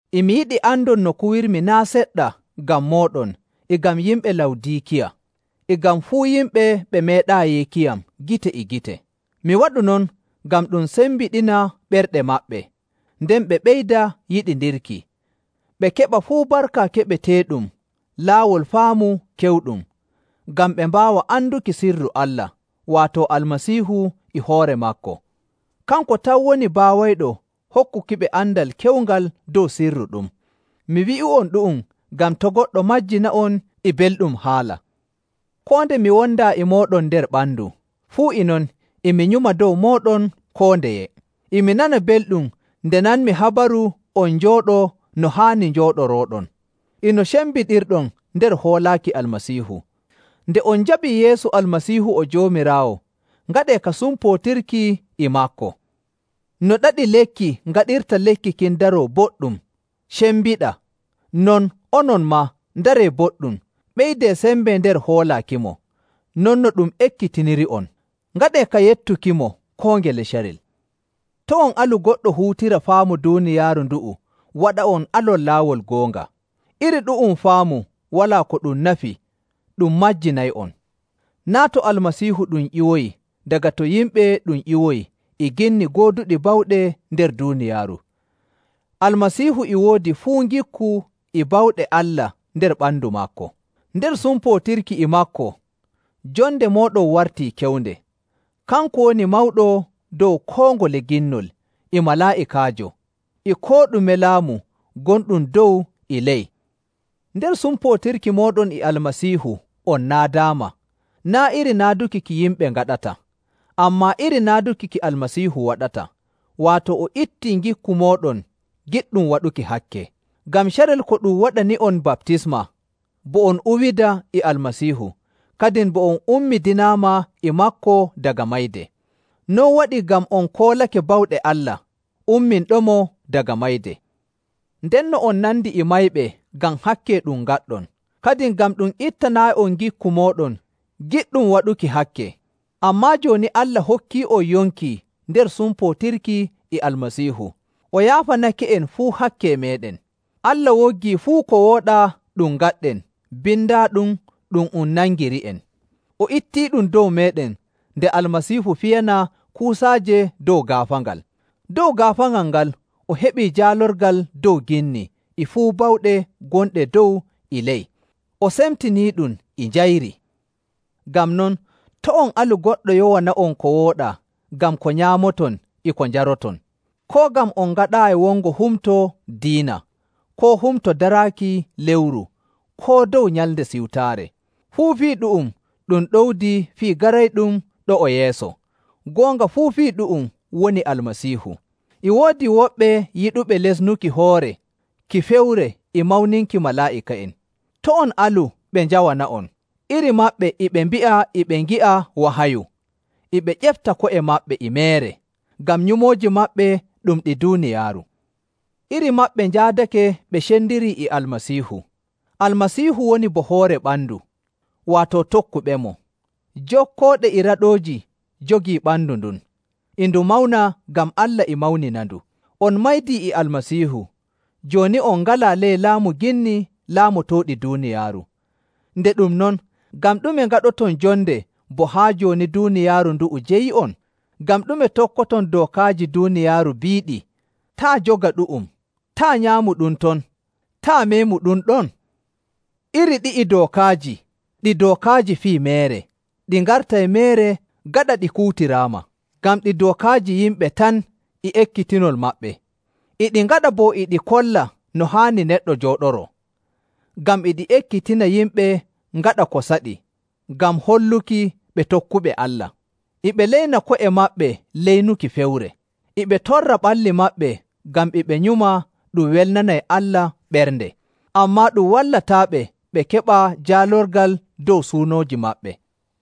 E mi yiɗi andon no kuwirmi naa' seɗɗa ngam mooɗon e ngam yimɓe Lawdiikiya, e ngam fuu yimɓe ɓe meeɗaayi yiikiyam gite e gite. Mi waɗu non ngam ɗum sembiɗina ɓerɗe maɓɓe, nden ɓe ɓeyda yiɗindirki, ɓe keɓa fuu barka keɓeteeɗum laawol faamu kewɗum, ngam ɓe mbaawa anduki sirru Allah, waato Almasiihu e hoore maako. Kanko tan woni baawayɗo hokkukiɓe andal kewngal dow sirru ɗum. Mi wi'u'on ɗu'um ngam to' goɗɗo majjina'on e belɗum haala. Koo nde mi wondaa e mooɗon nder ɓandu, fuu e non e mi nyuma dow mooɗon koo ndeye. E mi nana belɗum nde nanmi habaru on jooɗoo no haani njooɗorooɗon, e no cembiɗirɗon nder hoolaaki Almasiihu. Nde on njaɓii Yeesu Almasiihu o Joomiraawo, ngaɗee ka sumpootirki e maako. No ɗaɗi lekki ngaɗirta lekki kin daroo boɗɗum, cembiɗa, non onon maa, ndaree boɗɗum, ɓeydee sembe nder hoolaakimo, non no ɗum ekkitiniri'on. Ngaɗee ka yettukimo koo ngele carel. To' on alu goɗɗo huutira faamu duuniyaaru ndu'u waɗa'on alon laawol goonga. Iri ɗu'um faamu walaa ko ɗum nafi ɗum majjinay'on. Naa' to Almasiihu ɗum ƴiwoyi, daga to yimɓe ɗum ƴiwoyi e ginni gooduɗi bawɗe nder duuniyaaru. Almasiihu e woodi fuu ngikku e bawɗe Allah nder ɓandu maako. Nder sumpootirki e maako, jonde mooɗon wartii kewnde. Kanko woni mawɗo dow koo ngole ginnol, e malaa'ikaajo, e koo ɗume laamu gonɗum dow e ley. Nder sumpootirki mooɗon e Almasiihu on naadaama, naa' iri naaduki ki yimɓe ngaɗata, ammaa iri naaduki ki Almasiihu waɗata, waato o ittii ngikku mooɗon giɗɗum waɗuki hakke. Ngam carel ko ɗum waɗani'on baptisma, bo on uwida e Almasiihu, kadin bo on ummidinaama e maako daga mayde. Non waɗi ngam on koolake bawɗe Allah, umminɗomo daga mayde. Ndenno on nandi e mayɓe ngam hakke ɗum ngaɗɗon, kadin ngam ɗum ittanaayi'on ngikku mooɗon giɗɗum waɗuki hakke. Ammaa jooni Allah hokkii'on yonki nder sumpootirki e Almasiihu. O yaafanake'en fuu hakke meeɗen. Allah woggii fuu ko wooɗaa ɗum ngaɗɗen bindaaɗum ɗum um nangiri'en. O ittiiɗum dow meeɗen nde Almasiihu fiyanaa kuusaaje dow gaafaangal. Dow gaafaangal ngal o heɓi jaalorgal dow ginni e fuu bawɗe gonɗe dow e ley, o semtiniiɗum e njayri. Ngam non, to' on alu goɗɗo yowana'on ko wooɗaa ngam ko nyaamoton e ko njaroton, koo ngam on ngaɗaayi wongo humto diina, koo humto daraaki lewru, koo dow Nyalnde Siwtaare. Fuu fii ɗu'um ɗum ɗowdi fii garayɗum ɗo'o yeeso, goonga fuu fii ɗu'um woni Almasiihu. E woodi woɓɓe yiɗuɓe lesnuki hoore ki fewre e mawninki malaa'ika'en. To' on alu ɓe njawana'on. Iri maɓɓe e ɓe mbi'a e ɓe ngi'a wahayu. E ɓe ƴefta ko'e maɓɓe e meere, ngam nyumooji maɓɓe ɗum ɗi duuniyaaru. Iri maɓɓe njaadake ɓe cendirii e Almasiihu. Almasiihu woni bo hoore ɓandu, waato tokkuɓemo. Jokkooɗe e raɗooji jogii ɓandu ndun, e ndu mawna ngam Allah e mawninandu. On maydii e Almasiihu. Jooni on ngalaa ley laamu ginni laamotooɗi duuniyaaru. Nde ɗum non, ngam ɗume ngaɗoton jonde bo haa jooni duuniyaaru ndu'u jeyi'on? Ngam ɗume tokkoton dookaaji duuniyaaru biiɗi, “Taa' joga ɗu'um,” “Taa' nyaamu ɗum ton,” “Taa' meemu ɗum ɗon?” Iri ɗi'i dookaaji ɗi dookaaji fii meere ɗi ngartay meere gaɗa ɗi kuutiraama, ngam ɗi dookaaji yimɓe tan e ekkitinol maɓɓe. E ɗi ngaɗa bo e ɗi kolla no haani neɗɗo jooɗoroo, ngam e ɗi ekkitina yimɓe ngaɗa ko saɗi ngam holluki ɓe tokkuɓe Allah. E ɓe leyna ko'e maɓɓe leynuki fewre, e ɓe torra ɓalli maɓɓe ngam e ɓe nyuma ɗum welnanay Allah ɓernde. Ammaa ɗum wallataaɓe ɓe keɓa jaalorgal dow suunooji maɓɓe.